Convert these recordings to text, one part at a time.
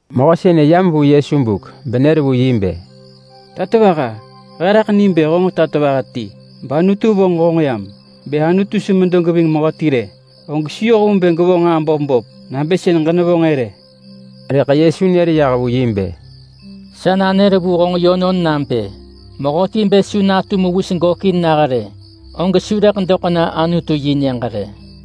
Mehö sënë yam vu Yesu buk benër vu yi bë, “Tatovaha! He raḳ nim bë honġ tatovaha ti, bAnutu vonġ honġ yam. Bë Anutu su medo geving mehöti rë, og su yoh vu bë rëḳ gevonġ nġaa böp böp nabë sën ġenevonġ-ë rë.” Rëḳ Yesu nër yah vu yi bë, “Sa nanër vu honġ yönon nabë: Mehöti bë su natu mewis gökin nah rë, og su rëḳ doḳ na Anutu-yi-nyëġ rë.”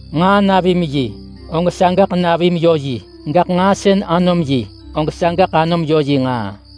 Nġaa navim yi, og sagaḳ navim yö yi. Gaḳ nġaa sën anom yi, og sagaḳ anom yö yi nġaa.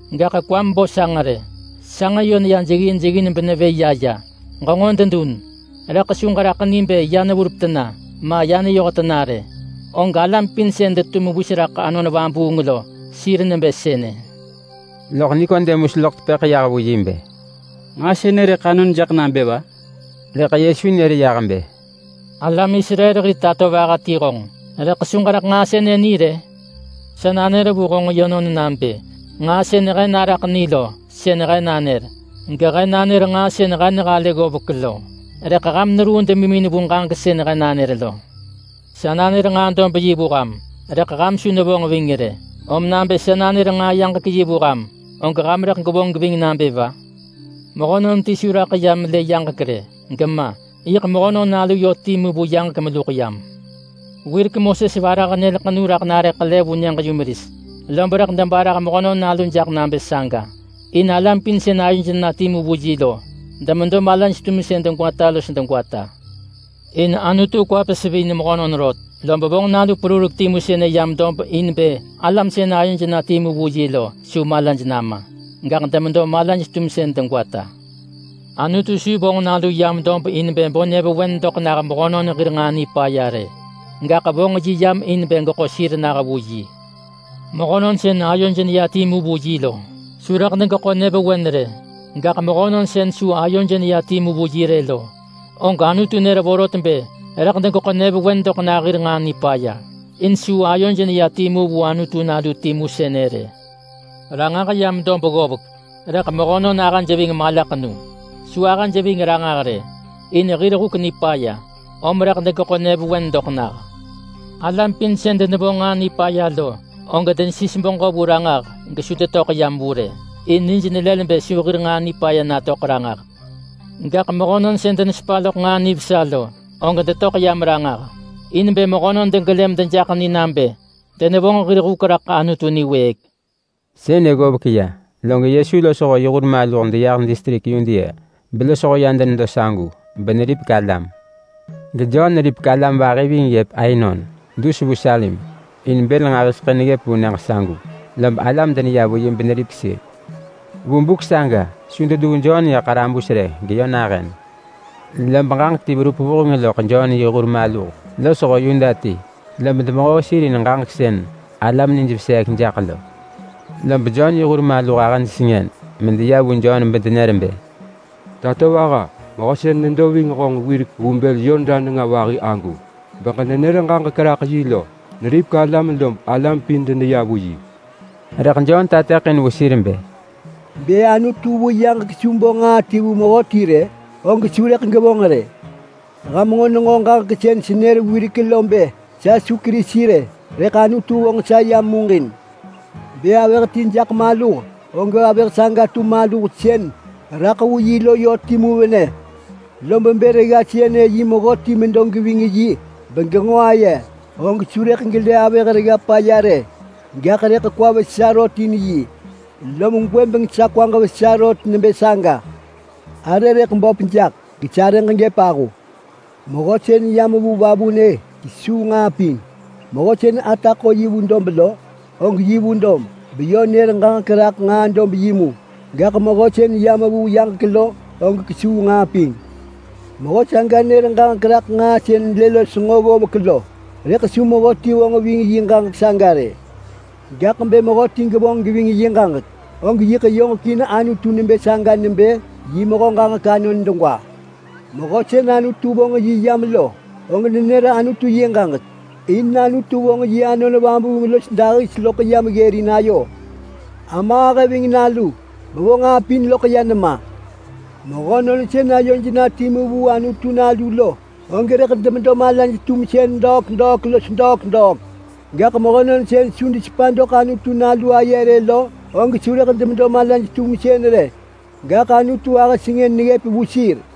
Gaḳ kwam bo sanġ rë. Sanġ yö neya jeggin jeggin benevë ya ya. Ġenġo dedun rëḳ su ġeraḳ ni bë ya neverup tena ma ya neyoh tena rë. Og alam pin sën detu mewis raḳ Anon Vabuung lo, sir nebë sënë.” Loḳ Nikodemus loḳ tepëḳ yah vu yi bë, “Nġaa sënë rëḳ anon jaḳ nabë va?” Rëḳ Yesu nër bë, “Alam Israel hir tatovaha ti honġ rëḳ su ġeraḳ nġaa sënë ni rë? Sa nanër vu honġ yönon nabë: Nġaa sën he naraḳ ni lo sën he nanër. Gehe nanër nġaa sën he nehalë ggovek lo. Rëḳ ham neruu demimin vu ġaġek sën he nanër lo. Sa nanër nġaa-dob-yi vu ham, rëḳ ham su nevonġ ving rë. Om nabë sa nanër nġaa-yaġek-yi vu ham, og ham rëḳ gwevonġ geving nabë va? Mehönon ti su raḳ ya melë yaġek rë, gema. Yiḳ Mehönon Nalu yö timu vu yaġek meluḳ yam. Wirek Moses varah nyël ḳenu raḳ nare ḳele vu nyëġ-yumeris, lob rëḳ debarah Mehönon Nalu jaḳ nabë saga, in alam pin sën ayoj na timu vu yi lo demedo malaj-tumsën degwata los degwata. In Anutu kwa pesivin mehönon rot, lob vonġ nalu perurek timu sënë yam dob in bë alam sën ayoj na timu vu yi lo su malaj nama. Gaḳ demedo malaj-tumsën degwata. Anutu su vonġ Nalu yam dob in bë bo nyëvewen doḳ nah mehönon hir nġaa nipaya rë. Gaḳ vonġ yi yam in bë geḳo sir nah vu yi. Mehönon sën ayoj neya timu vu yi lo su rëḳ degeḳo nyëvewen rë. Gaḳ mehönon sën su ayoj neya timu vu yi rë lo, og Anutu nër vorot bë rëḳ degeḳo nyëvewen doḳ nah hir nġaa nipaya, in su ayoj neya timu vu Anutu Nalu timu sënë rë. Ranġah yam dob ggovek, rëḳ mehönon ahëj ving malaḳenu. Su ahëj ving ranġah rë, in hir huk nipaya, om rëḳ degeḳo nyëvewen doḳ nah. Alam pin sën denevonġ nġaa nipaya lo, og denesis beġö vu Ranġah gesu detöḳ yam vu rë, in nij nelël bë su hir nġaa nipaya natöḳ ranġah. Gaḳ mehönon sën denesepa loḳ nġaa nivesa lo, og detöḳ yam ranġah, in bë mehönon degelë medejaḳ ni nabë denevonġ hir huk raḳ Anutu niwëëk.” Sënë ggovek ya, log Yesu losho yi hur maluh deyah distrik Yudea belosho ya denedo sagu, beneripek alam. GeJon neripek alam vahi ving ggëp Ainon, dus vu Salim. In bël nġahiseḳë neggëp vu nyëġ sagu, lob alam deneya vu yi beneripek sir. Vu buk saga su deduu Jon ya ḳarabus rë geyö nahën. Lob ġaġek ti verup vuheng loḳ Jon yi hur maluh losho Yuda ti, lob demehoo sir in ġaġek sën alam nij veseek jaḳ lo. Lob Jon yi hur maluh ahëj sengën medeya vu Jon bedenër bë, “Tatovaha! Mehö sën nedo ving honġ wirek vu bël Yordan nenga vahi agu, beġenenër ġaġek raḳ yi lo, neripek alam lob alam pin deneya vu yi!” Rëḳ Jon tateḳin vu sir bë, “Bë Anutu vu yaġek su bo nġaa ti vu mehöti rë, og su rëḳ gevonġ rë. Ham nġo nenġo ġaġek sën senër wirek lo bë sa su Kerisi rë, rëḳ Anutu vonġ sa yam muġin. Bë avëh ti jaḳ maluh, og avëh saga tu maluh sën raḳ vu yi lo yö timu venë. Lob bë regga sënë yi mehöti medo geving yi begenġo aye, og su rëḳ gelë avëh regga paya rë, gaḳ rëḳ kwa vesa rot in yi. Lom gwëbeng sa kwaġ vesa rot nebë saga. Arë rëḳ böp jaḳ, gesarëġ gëp ahu. Mehö sën yam vu vavunë kesuu nġaa pin. Mehö sën ata ḳo yi vu dob lo, og yi vu dob, beyö nër ġaġek raḳ nġaa-dob-yi mu. Gaḳ mehö sën yam vu yaġek lo, og kesuu nġaa pin. Mehö saga nër ġaġek raḳ nġaa sën lë los nġo ggovek lo, rëḳ su mehöti vonġ ving yi ġaġek saga rë. Gaḳ bë mehöti gevonġ geving yi ġaġek, og yiḳ yoġekin Anutu nebë saga nebë yi mehö ġaġek anon degwa. Mehö sën Anutu vonġ yi yam lo, og nenër Anutu yi ġaġek, in Anutu vonġ yi Anon Vabuung los dahis loḳ yam ggërin ayo. Ama ahë ving Nalu, bevo nġaa pin loḳ ya nema. Mehönon sën ayoj na timu vu Anutu Nalu lo, og rëḳ demedo malaj-tumsën degwata los degwata. Gaḳ mehönon sën su desepa doḳ Anutu Nalu aye rë lo, og su rëḳ demedo malaj-tumsën rë. Gaḳ Anutu ahë sengën neggëp vu sir.”